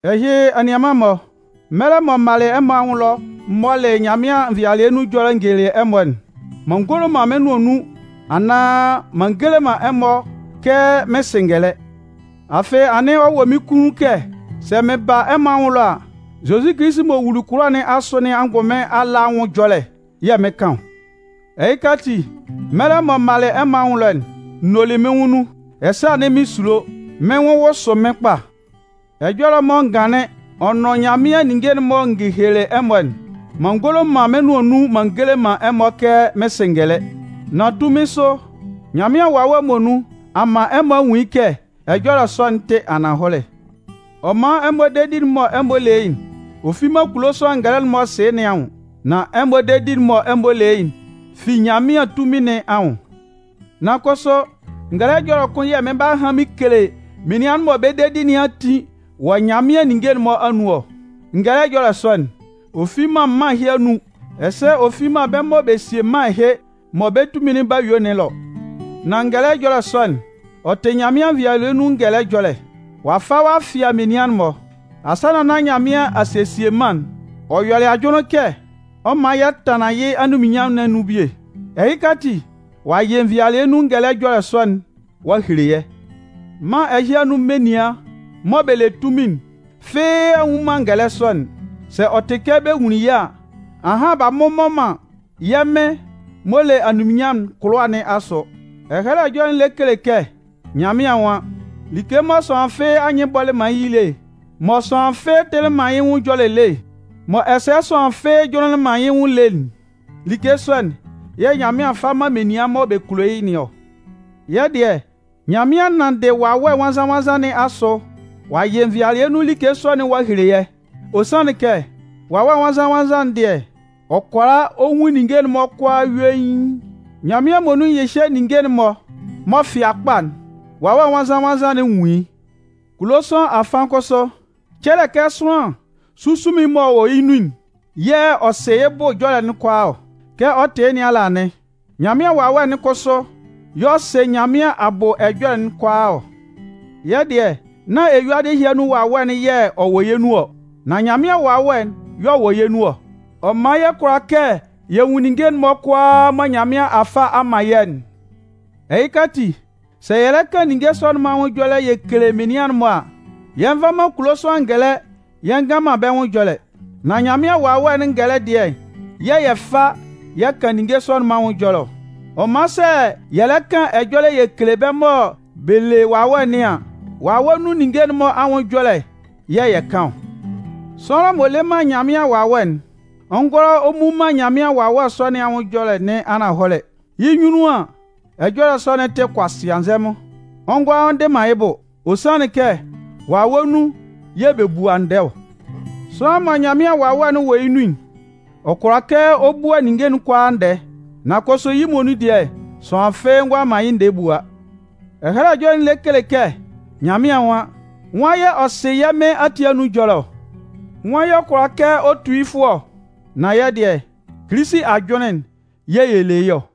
Ɛhɩ, anianman-mɔ, mɛlɛ mɔ m malɩ ɛmɔ anwʋn ɛlɔ m mɔlɩ Nyanmɩan nvɩalɩɛ nun Ɛjɔlɛkpa'n n gelelɩ ɛmɔ'n, m'an ngolo man mɩ́n nʋan nun anaan m'an ngele ɛmɔ kɛ mɩn sɩ ngɛlɛ. Afɩ anɩn ɔ wɔ mɩ́n kunnun kɛ sɛ mɩn ba ɛmɔ anwʋn ɛlɔ a, Zozi Kilisi m'ɔ wuli kʋlʋwa nɩn asʋ nɩn angʋnmɩn ala anwʋn ɛjɔlɛ yɛ̂ mɩn 'kan ɔ. Ɛhɩka ati, mɛlɛ mɔ m malɩ ɛmɔ anwʋn ɛlɔ'n, n nolɩ mɩ́n nwʋn nun, ɛsɛ anɩn mɩn sulo, mɩ́n nwʋn wʋsʋ mɩ́n kpa. Ɛjɔlɛ mɔ n ganlɩn ɔ nʋn Nyanmɩan ninnge'n mɔ n gekelelɩ ɛmɔ'n, m'an ngolo man mɩ́n nʋan nun m'an gele man ɛmɔ kɛ mɩn sɩ ngɛlɛ. Nan tunmin sʋ, Nyanmɩan Wawɛ'n muonun a man ɛmɔ a nwun yɩ́ kɛ ɛjɔlɛ sɔ'n tɩ ananhɔlɛ. Ɔ man ɛmɔ dedi'n mɔ ɛmɔ le yɩ́'n, ɔ fi man kulo sʋanlan ngɛlɛ'n m'ɔ sɩ nɩn anwʋn. Nan ɛmɔ dedi'n mɔ ɛmɔ le yɩ́'n fi Nyanmɩan tunmin nɩn anwʋn. Nan kʋsʋ ngɛlɛ ɛjɔlɛ kʋn yɛ̂ mɩn 'ba han mɩn kele menian mɔ bɛ́ dedi nɩn a tin wɔ Nyanmɩan ninnge'n-mɔ anun ɔ. Ngɛlɛ ɛjɔlɛ sɔ'n, ɔ fi man mân ɛhɩ anun, ɛsɛ ɔ fi man bɛ́ mɔ bɛ sie mân ɛhɩ mɔ bɛ́ tunmin'n 'ba yue nɩn ɛlɔ. Nan ngɛlɛ ɛjɔlɛ sɔ'n, ɔ tɩ Nyanmɩan nvɩalɩɛ nun ngɛlɛ ɛjɔlɛ. Ɔ'a fa ɔ'a fɩa menian'n-mɔ. Asannan nán Nyanmɩan a sesie mân'n, ɔ yɔlɩ ajʋnlɩn kɛ ɔ 'man yɛ tanlan yɩ́ anunminnyanmʋn nɩn anun bie. Ɛhɩka ati, ɔ'a yɩ nvɩlɩɛ nun ngɛlɛ ɛjɔlɛ sɔ'n ɔ'a hele yɛ́. Mân ɛhɩ anun menian mɔ bɛ le tunmin'n fɩ́ɩ́ a nnwun man ngɛlɛ sɔ'n. Sɛ ɔ tɩ kɛ bɛ nwunlin yɩ́ a, ahan b'a mmʋbɔ man yɛ́ Mɩn m'ɔ le anunminnyanmʋn'n kʋlʋwa nɩn asʋ. Ɛhɛlɛ Ɛjɔlɛ'n lɛ kele kɛ Nyanmɩan nwan: Like mɔ sʋanlan fɩ́ɩ́ anyɩn bɔlɩ man yɩ́ lé, mɔ sʋanlan fɩ́ɩ́ tɩlɩ man yɩ́ nwʋn ɛjɔlɛ lé, mɔ ɛsɛ sʋanlan fɩ́ɩ́ jʋnlɩnlɩn man yɩ́ nwʋn lé'n, like sɔ'n yɛ̂ Nyanmɩan fa man menian mɔ bɛ kulo yɩ́ nɩn ɔ. Yɛ́ dɩɛ, Nyanmɩan nanndɩ Wawɛ Nwannzan-nwannzan nɩn asʋ ɔ'a yɩ nvɩalɩɛ nun like sɔ'n ɔ'a hele yɛ́. Ɔ sanlɩn kɛ, Wawɛ Nwannzan-nwannzan'n dɩɛ, ɔ kʋala ɔ nwun ninnge'n-mɔ kʋalaa yuein. Nyanmɩan muonun nyɩhyɛ ninnge'n-mɔ m'ɔ fɩa kpa'n, Wawɛ Nwannzan-nwannzan'n nwun yɩ́. Kulo sʋanlan afan kʋsʋ, cɛlɛ kɛ sʋanlan sunsunmin'n m'ɔ wɔ yɩ́ nun'n yɛ̂ ɔ sɩ yɩ́ bʋ ɛjɔlɛ'n kʋalaa ɔ. Kɛ ɔ tɩ yɩ́ nɩn ala anɩn, Nyanmɩan Wawɛ'n kʋsʋ y'ɔ sɩ Nyanmɩan abʋ ɛjɔlɛ'n kʋalaa ɔ. Yɛ́ dɩɛ nán eyuadɩ ɛhɩ anun wawɛ'n yɛ̂ ɔ wɔ yɛ́ nun ɔ. Nan Nyanmɩan Wawɛ'n y'ɔ wɔ yɛ́ nun ɔ. Ɔ man yɛ kʋala kɛ yɛ nwun ninnge'n-mɔ kʋalaa mɔ Nyanmɩan a fa a man yɛ́'n. Ɛhɩka ati, sɛ yɛ lɛ kan ninnge sɔ'n-mɔ anwʋn ɛjɔlɛ yɛ kele menian'n-mɔ a, yɛ nva man kulo sʋanlan ngɛlɛ yɛ ngan man bɛ́ nwʋn ɛjɔlɛ. Nan Nyanmɩan Wawɛ'n ngɛlɛ dɩɛ'n yɛ̂ yɛ fa yɛ kan ninnge sɔ'n-mɔ anwʋn ɛjɔlɛ ɔ. Ɔ man sɛ yɛ lɛ kan ɛjɔlɛ yɛ kele bɛ́ mɔ bɛ le Wawɛ nɩn an, wawɛ nun ninnge'n-mɔ anwʋn ɛjɔlɛ yɛ̂ yɛ kan ɔ. Sʋanlan m'ɔ le man Nyanmɩan Wawɛ'n, ɔ ngʋala ɔ mmu man Nyanmɩan Wawɛ sɔ nɩn ɛjɔlɛ nɩn ananhɔlɛ. Yɩ́ nyunnun an, ɛjɔlɛ sɔ'n tɩ kʋasɩanzɛmʋn, ɔ ngʋala ɔ ndɩ man yɩ́ bʋ. Ɔ sanlɩn kɛ wawɛ nun yɛ̂ bɛ bua ndɛɛ ɔ. Sʋanlan mɔ Nyanmɩan Wawɛ'n wɔ yɩ́ nun'n, ɔ kʋala kɛ ɔ bua ninnge kʋalaa ndɛɛ. Nan kʋsʋ yɩ́ muonun dɩɛ, sʋanlan fɩ́ɩ́ ngʋala man yɩ́ ndɛɛ bua. Ɛhɛlɛ Ɛjɔlɛ'n lɛ kele kɛ Nyanmɩan nwan: Nwan yɛ̂ ɔ sɩ yɛ́ Mɩn ati anun ajʋnlɩn ɔ? Nwan yɛ̂ ɔ kʋala kɛ ɔ tu yɩ́ fʋ ɔ? Nan yɛ́ dɩɛ, Kilisi ajʋnlɩn'n yɛ̂ yɛ le yɩ́ ɔ.